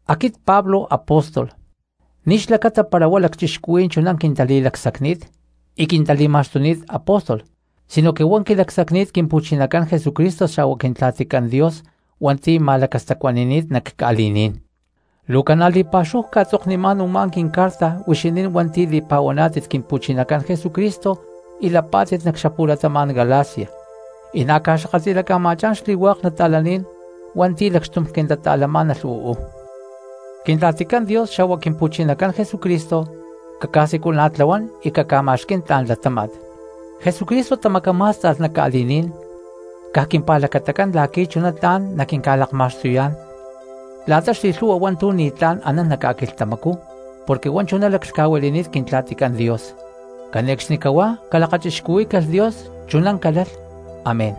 Aquit Pablo apóstol, ni̠ xlacata para huá lacchixcuhuí̠n chuná quintali̠lacsacni̠t y quintali̠ma̠xtuni̠t apóstol sinoque huá quilacsacni̠t Quimpu̠chinacán Jesucristo xa̠hua Quintla̠ticán Dios hua̠nti̠ ma̠lacastacuani̠ni̠t nac ca̠li̠ní̠n. Luu ca̠na li̠pa̠xúhu cca̠tzoknimá̠n u̠má quincarta huixinín hua̠nti̠ li̠pa̠huaná̠tit Quimpu̠chinacán Jesucristo y lapá̠tit nac xapu̠latama̠n Galacia, y na̠ ca̠xakatli̠laca̠ma̠chá̠n xli̠hua̠k nata̠laní̠n hua̠nti̠ lacxtum quintata̠lamá̠nalh uú. Quintla̠ticán Dios xa̠hua Quimpu̠chinacán Jesucristo caca̠siculana̠tlahuán y caca̠ma̠xquí̠n tla̠n latáma̠t. Jesucristo tamacamá̠sta̠lh nac ca̠li̠ní̠n caj quimpa̠lacatacán la̠qui̠ chuná tla̠n naquinca̠lakma̠xtuyá̠n la̠ta xli̠lhu̠hua hua̠ntu̠ ni̠tlá̠n anán nac ca̠quilhtamacú porque huá chuná laclhca̠huili̠ni̠t Quintla̠ticán Dios. ¡Cane̠cxnicahuá calakachixcuhuí̠calh Dios! Chuná calalh, amén.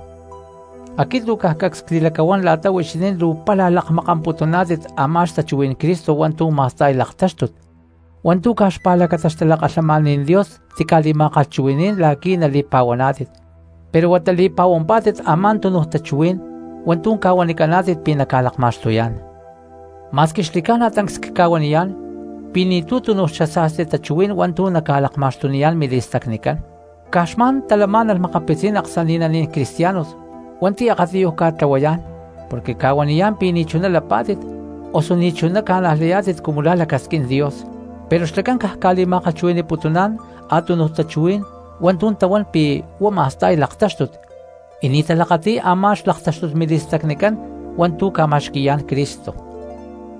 Aquit luu caj cacs cli̠lacahuán la̠ta huixinín luu pála lakmakamputuná̠tit a̠má xtachuhuí̠n Cristo hua̠ntu̠ ma̠sta̠y laktáxtut hua̠ntu̠ caj xpa̠lacata xtalakalhamaní̠n Dios tica̠li̠ma̠kalhchuhui̠ní̠n la̠qui̠ nali̠pa̠huaná̠tit, pero huata li̠pahuampá̠tit a̠má túnuj tachuhuí̠n hua̠ntu̠ ca̠huanicaná̠tit pi̠ naca̠lakma̠xtuyá̠n. Ma̠squi xli̠ca̠na tancs cca̠huaniyá̠n pi̠ ni̠tu̠ túnuj xasa̠sti tachuhuí̠n hua̠ntu̠ naca̠lakma̠xtuniyá̠n mili̠stacnicán, caj xma̠n talamá̠nalh makapitzí̠n aksani̠naní̠n cristianos hua̠nti̠ akatiyuj ca̠tlahuayá̠n porque ca̠huaniyá̠n pi̠ ni̠chuná lapá̠tit osu ni̠ chuná ca̠najlayá̠tit cumu la̠ lacasquín Dios; pero xlacán caj ca̠li̠ma̠kalhchui̠ni̠putuná̠n a̠túnuj tachuhuí̠n hua̠ntu̠ tahuán pi̠ huá ma̠sta̠y laktáxtut y ni̠ talakati̠y a̠má xlaktáxtut mili̠stacnicán hua̠ntu̠ ca̠ma̠xqui̠yá̠n Cristo.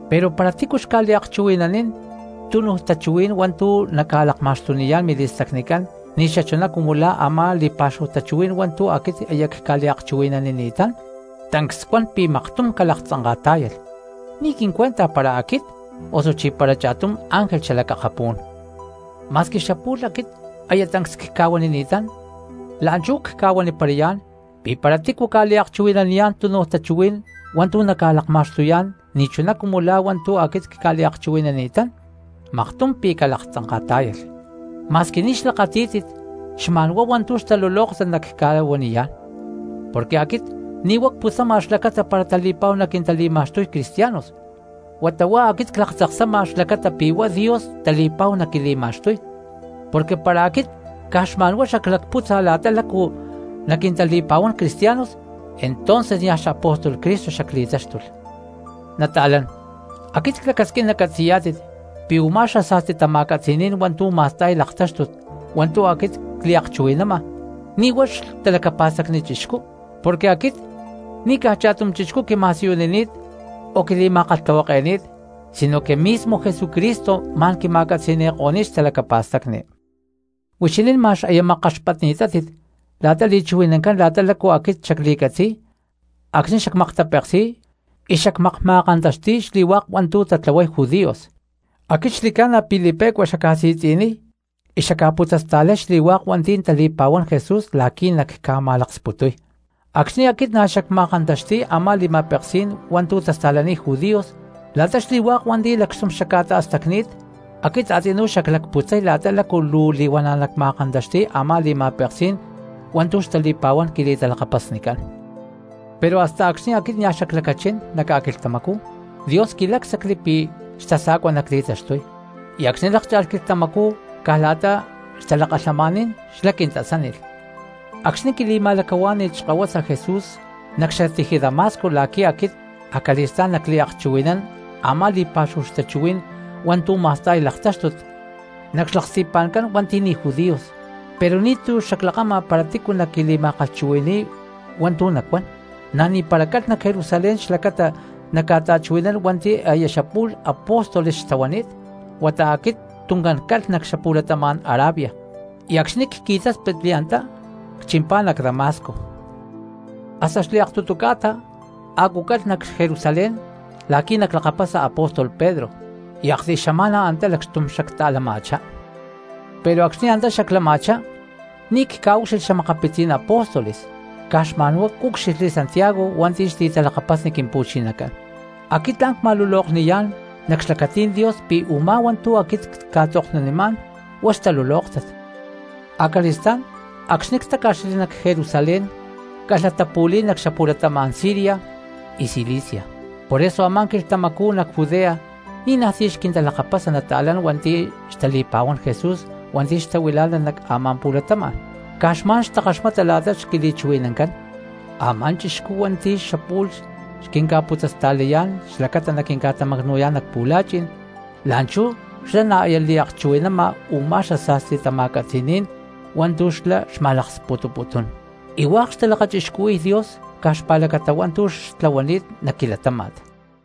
Pero para tícu xca̠liakchuhui̠nanín túnuj tachuhuí̠n hua̠ntu̠ naca̠lakma̠xtuniyá̠n mili̠stacnicán ni̠xachuná cumu la̠ ama̠ li̠pa̠xúhu tachuhuí̠n hua̠ntu̠ aquit aya cca̠li̠ma̠kalhchuhui̠ni̠ni̠tán, tancs cuan pi̠ maktum calaktzanka̠tá̠yalh, ni̠ quincuenta para aquit osuchí para cha̠tum ángel xalac akapú̠n. Ma̠squi xapu̠lh aquit aya tancs cca̠huanini̠tán, la̠nchú cca̠huaniparayá̠n pi̠ para tícu ca̠liakchuhui̠naniyá̠n túnuj tachuhuí̠n hua̠ntu̠ naca̠lakma̠xtuyá̠n ni̠chuná cumu la̠ hua̠ntu̠ aquit cca̠li̠ma̠kalhchuhui̠ni̠ni̠tán, maktum pi̠ calaktzanka̠tá̠yalh. Ma̠squi ni̠ xlakatí̠tit xma̠nhuá hua̠ntu̠ xtalulóktat nacca̠huaniyá̠n, porque aquit ni̠ huá cputzama xlacata para tali̠pa̠hua naquintali̠ma̠xtuy cristianos, huata huá aquit claktzaksama xlacata pi̠ huá Dios tali̠pa̠hu naquili̠ma̠xtuy. Porque para aquit caj xma̠n huá xaclacpútza la̠ta lácu naquintali̠pa̠huán cristianos entonces niaj xapóstol Cristo xacli̠táxtulh. Nata̠lán, aquit clacasquín nacatzi̠yá̠tit pi̠ u̠má xasa̠sti tama̠catzi̠ní̠n hua̠ntu̠ ma̠sta̠y laktáxtut hua̠ntu̠ aquit cliakchuhui̠nama, ni̠ huá xtalacapa̠stacnicán cristianos. Porque aquit ni̠ caj cha̠tum chixcú quima̠siyunini̠t o quili̠ma̠kalhtahuake̠ni̠t, sinoque mismo Jesucristo ma̠n quima̠catzi̠ni̠ko̠ni̠t xtalacapa̠stacni. Huixinín ma̠x aya makkaxpatni̠tátit la̠ta li̠chuhui̠nancán la̠ta lácu aquit xacli̠catzi̠y acxni̠ xacmaktapeksi̠y y xacmakma̠kantaxti̠y xli̠hua̠k hua̠ntu̠ tatlahuay judíos; aquit xli̠ca̠na pi̠ li̠pe̠cua xacca̠si̠tzi̠niy y xacca̠putzasta̠lay xli̠hua̠k hua̠nti̠ tali̠pa̠huán Jesús la̠qui̠ nacca̠ma̠laksputuy. Acxni̠ aquit na̠ xacma̠kantaxti̠y a̠má li̠ma̠peksí̠n hua̠ntu̠ tasta̠laniy judíos, la̠ta xli̠hua̠k hua̠nti̠ lacxtum xacca̠ta̠stacni̠t aquit a̠tzinú xaclacputzay la̠ta lácu luu li̠huana̠ nacma̠kantaxti̠y a̠má li̠ma̠peksí̠n hua̠ntu̠ xtali̠pa̠huán quili̠talakapasnicán. Pero hasta acxni̠ aquit nia̠ xaclacachín nac ca̠quilhtamacú Dios quilácsacli pi̠ xtasa̠cua nacli̠taxtuy, y acxni̠ lákcha̠lh quilhtamacú caj la̠ta xtalakalhamaní̠n xlá quintasánilh acxni̠ quili̠ma̠lacahuá̠ni̠lh xkahuasa Jesús nac xatiji Damasco la̠qui̠ aquit acali̠stá̠n nacliakchuhui̠nán a̠má li̠pa̠xúhu xtachuhuí̠n hua̠ntu̠ ma̠sta̠y laktáxtut nac xlaksti̠pa̠ncán hua̠nti̠ ni̠ judíos. Pero ni̠tu̠ xaclakama para tícu naquili̠ma̠kalhchuhui̠ni̠y hua̠ntu̠ nacuán, na̠ ni̠para calh nac Jerusalén xlacata nacca̠ta̠chuhui̠nán hua̠nti̠ aya xapu̠lh apóstoles xtahuani̠t, huata aquit tuncán calh nac xapu̠latama̠n Arabia, y acxni̠ cqui̠táspitli antá cchimpá nac Damasco. Hasta xliaktutu ca̠ta a̠cu calh nac Jerusalén la̠qui̠ naclakapasa apóstol Pedro y aktiy xama̠na antá lacxtum xacta̠lama̠chá. Pero acxni̠ antá xaclama̠chá ni̠ cca̠ucxilhli xa̠makapitzí̠n apóstoles caj xma̠nhuá cúcxilhli Santiago hua̠nti̠ xli̠talakapasni Quimpu̠chinacán. Aquit tla̠n cca̠ma̠lulokniyá̠n nac xlacatí̠n Dios pi̠ u̠má hua̠ntu̠ aquit cca̠tzoknunimá̠n huá xtalulóktat. Acali̠stá̠n acxni̠ ctáca̠xli nac Jerusalén calh latapu̠li̠y nac xapu̠latama̠n Siria y Cilicia. Por eso a̠má quilhtamacú nac Judea ni̠najtí xquintalakapasa nata̠lán hua̠nti̠ xtali̠pa̠huán Jesús hua̠nti̠ xtahuilá̠nalh nac a̠má pu̠latama̠n. Caj xma̠n xtakaxmata la̠ta xquili̠chuhui̠nancán: “Amá chixcú hua̠nti̠ xapu̠lh xquinca̠putzasta̠layá̠n xlacata naquinca̠tamacnu̠yá̠n nac pu̠la̠chi̠n, la̠nchú xlá na̠ aya liakchuhui̠nama u̠má xasa̠sti tama̠catzi̠ní̠n hua̠ntu̠ xlá xma̠laksputuputún.” Y hua̠k xtalakachixcuhui̠y Dios caj xpa̠lacata hua̠ntu̠ xlá tlahuani̠t nac quilatáma̠t.